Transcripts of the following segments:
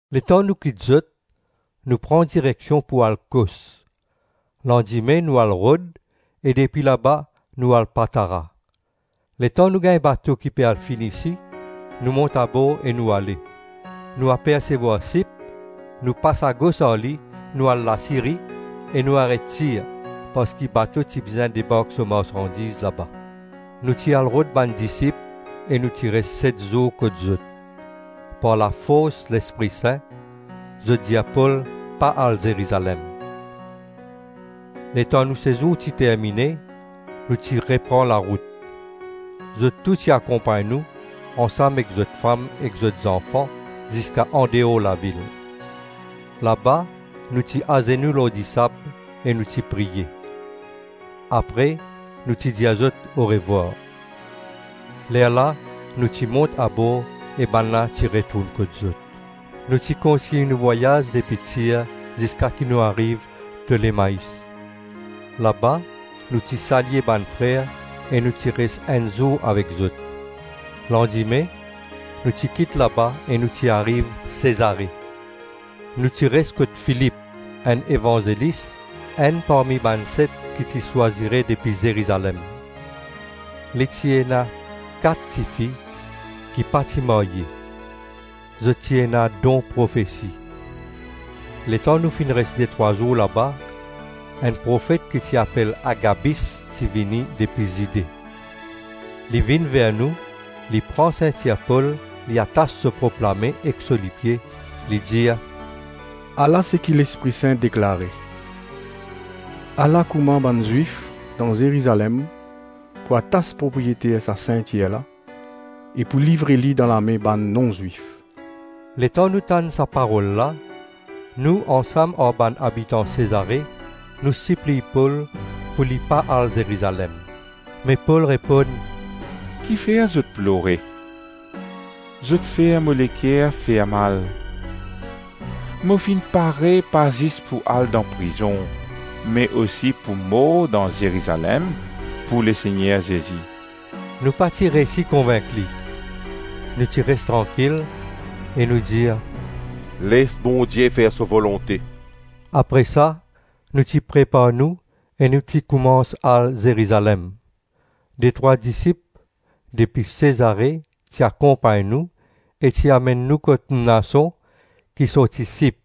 Letan nou kit zot, nou pran direksion pou al Kos; landime nou al Rod, e depi laba nou al Patara. Letan nou gagn bato ki pe al Fenisi, nou mont abor e nou ale. Nou apersevwar Sip, nou pas agos ar li nou al Lasiri, e nou aret Tir parski bato ti bizin debark so marsandiz laba. Nou ti al rod bann disip e nou ti res set zour kot zot. Par lafors Lespri Sin zot dir Pol pa al Zerizalem. Letan nou sezour ti termine, nou ti repran larout. Zot tou ti akonpagn nou, ansam ek zot fam ek zot zanfan ziska andeor lavil. Laba nou ti azenou lor disab e nou ti priye. Apre nou ti dir zot orevwar. Lerla nou ti mont abor e bannla ti retourn kot zot. Nou ti kontign nou vwayaz depi Tir ziska ki nou ariv Tolemais. Laba nou ti salye bann frer e nou ti res enn zour avek zot. Landime nou ti kit laba e nou ti ariv Sezare. Nou ti res kot Filip, enn evanzelis, enn parmi bann set ki ti swazire depi Zerizalem. Li ti ena kat tifi ki pa ti marye; zot ti ena don profesi. Letan nou finn res detrwa zour laba, enn profet ki ti apel Agabis ti vini depi Zide. Li vinn ver nou, li pran sintir Pol li atas so prop lame ek so lipie, li dir, “Ala seki Lespri Sin deklare: ‘Ala kouma bann Zwif dan Zerizalem pou atas propriyeter sa sintir la e pou livre li dan lame bann non-Zwif.’” Letan nou tann sa parol la, nou ansam ar bann abitan Sezare, nou sipliy Pol pou li pa al Zerizalem. Me Pol reponn, “Kifer zot plore? Zot fer mo leker fermal. Mo finn pare pa zis pou al dan prizon, me osi pou mor dan Zerizalem pou Lesegner Zezi.” Nou pa ti reysi konvink li, nou ti res trankil, e nou dir, “Les Bondie fer so volonte.” Apre sa nou ti prepar nou e nou ti koumans al Zerizalem. Detrwa disip depi Sezare ti akonpagn nou, e ti amenn nou kot Mnason ki sorti Sip,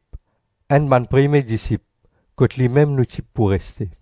enn bann premie disip, kot limem nou ti pou reste.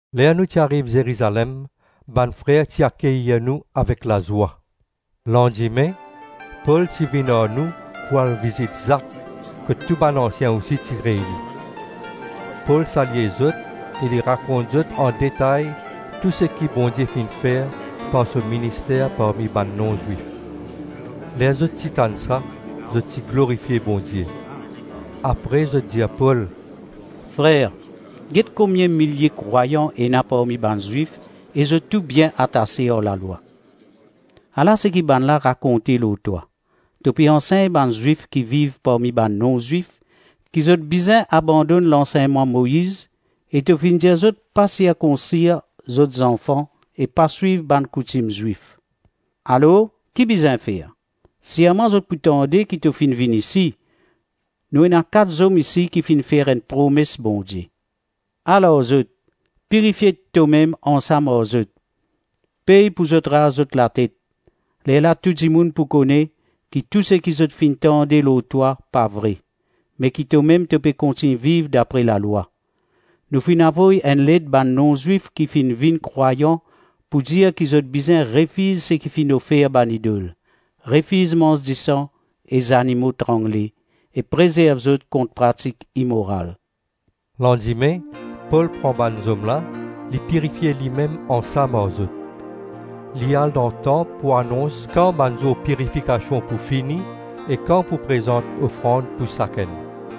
Ler nou ti ariv Zerizalem bann frer ti akeyir nou avek lazwa. Landime Pol ti vinn ar nou pou al vizit Zak kot tou bann ansien osi ti reyni. Pol salye zot e li rakont zot andetay tou seki Bondie finn fer par so minister parmi bann non-Zwif. Ler zot ti tann sa, zot ti glorifie Bondie. Apre zot dir Pol, “Frer, get komie milie krwayan ena parmi bann Zwif e zot tou bien atase ar Lalwa. Ala seki bannla rakonte lor twa: to pe ansegn bann Zwif ki viv parmi bann non-Zwif ki zot bizin abandonn lansegnman Moiz e to finn dir zot pa sirkonsir zot zanfan e pa swiv bann koutim Zwif. Alors, ki bizin fer? Sirman zot pou tande ki to finn vinn isi. Nou ena kat zom isi ki finn fer enn promes Bondie. Al ar zot, pirifie tomem ansam ar zot, pey pou zot raz zot latet. Lerla tou dimoun pou kone ki tou seki zot finn tande lor twa pa vre; me ki tomem to pe kontign viv dapre lalwa. Nou finn avoy enn let bann non-Zwif ki finn vinn krwayan pou dir ki zot bizin refiz seki finn ofer bann idol, refiz manz disan, e zanimo trangle, e prezerv zot kont pratik imoral.” Landime Pol pran bann zom la, li pirifie limem ansam ar zot. Li al dan tanp pou anons kan bann zour pirifikasion pou fini, e kan pou prezant ofrand pou sakenn.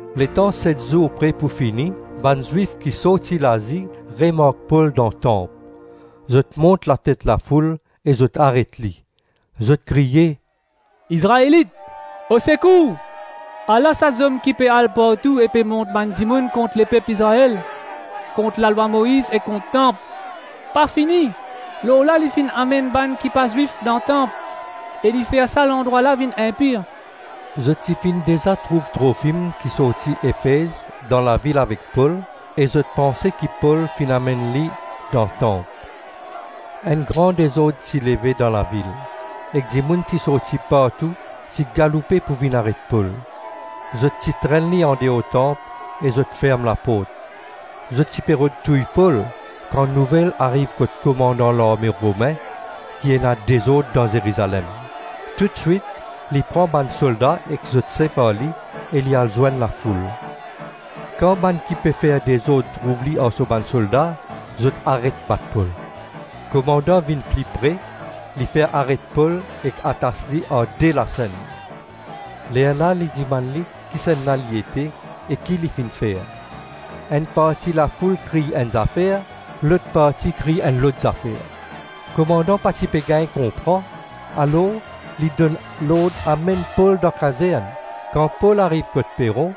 Letan set zour pre pou fini, bann Zwif ki sorti Lazi remark Pol dan tanp. Zot mont latet lafoul e zot aret li. Zot kriye, “Izraelit, osekour, ala sa zom ki pe al partou e pe mont bann dimoun kont lepep Izrael, kont Lalwa Moiz e kont tanp. Pa fini, lor la li finn amenn bann ki pa Zwif dan tanp e li fer sa landrwa la vinn inpir.” Zot ti finn deza trouv Trofim ki sorti Efez dan lavil avek Pol e zot panse ki Pol finn amenn li dan tanp. Enn gran dezord ti leve dan lavil, ek dimoun ti sorti partou ti galoupe pou vinn aret Pol. Zot ti trenn li andeor tanp e zot ferm laport. Zot ti pe rod touy Pol kan nouvel ariv kot komandan larme Romin ki ena dezord dan Zerizalem. Toutswit li pran bann solda ek zot sef ar li e li al zwenn lafoul. Kan bann ki pe fer dezord trouv li ar so bann solda, zot aret bat Pol. Komandan vinn pli pre, li fer aret Pol ek atas li ar de lasenn. Lerla li dimann li kisannla li ete e ki li finn fer. Enn parti lafoul kriy enn zafer, lot parti kriy enn lot zafer. Komandan pa ti pe gagn konpran, alors li donn lord amenn Pol dan kazern. Kan Pol ariv kot peron,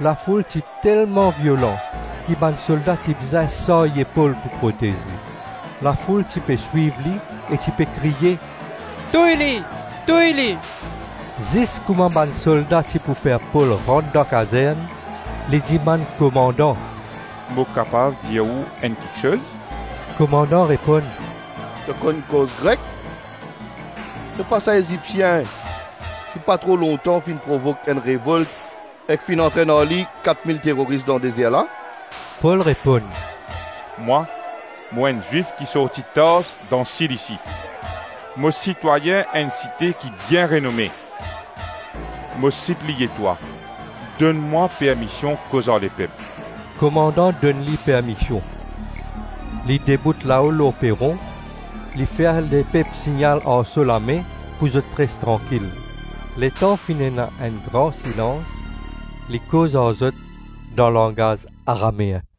lafoul ti telman violan ki bann solda ti bizin sarye Pol pou protez li. Lafoul ti pe swiv e ti pe kriye, “Touy li! Touy li!” Zis kouma bann solda ti pou fer Pol rant dan kazern, li dimann komandan, “Mo kapav dir ou enn kiksoz?” Komandan reponn, “To konn koz Grek? To pa sa Ezipsien ki pa tro lontan finn provok enn revolt ek finn antrenn ar li kat mil teroris dan dezer la?” Pol reponn, “Mwa mo enn Zwif ki sorti Tars dan Silisi; mo sitwayin enn site ki bien renome. Mo sipliye twa donn mwa permision koz ar lepep.” Komandan donn li permision. Li debout lao peron, li fer lepep signal ar so lame pou zot res trankil. Letan finn ena enn gran silans, li koz ar zot dan langaz Arameen.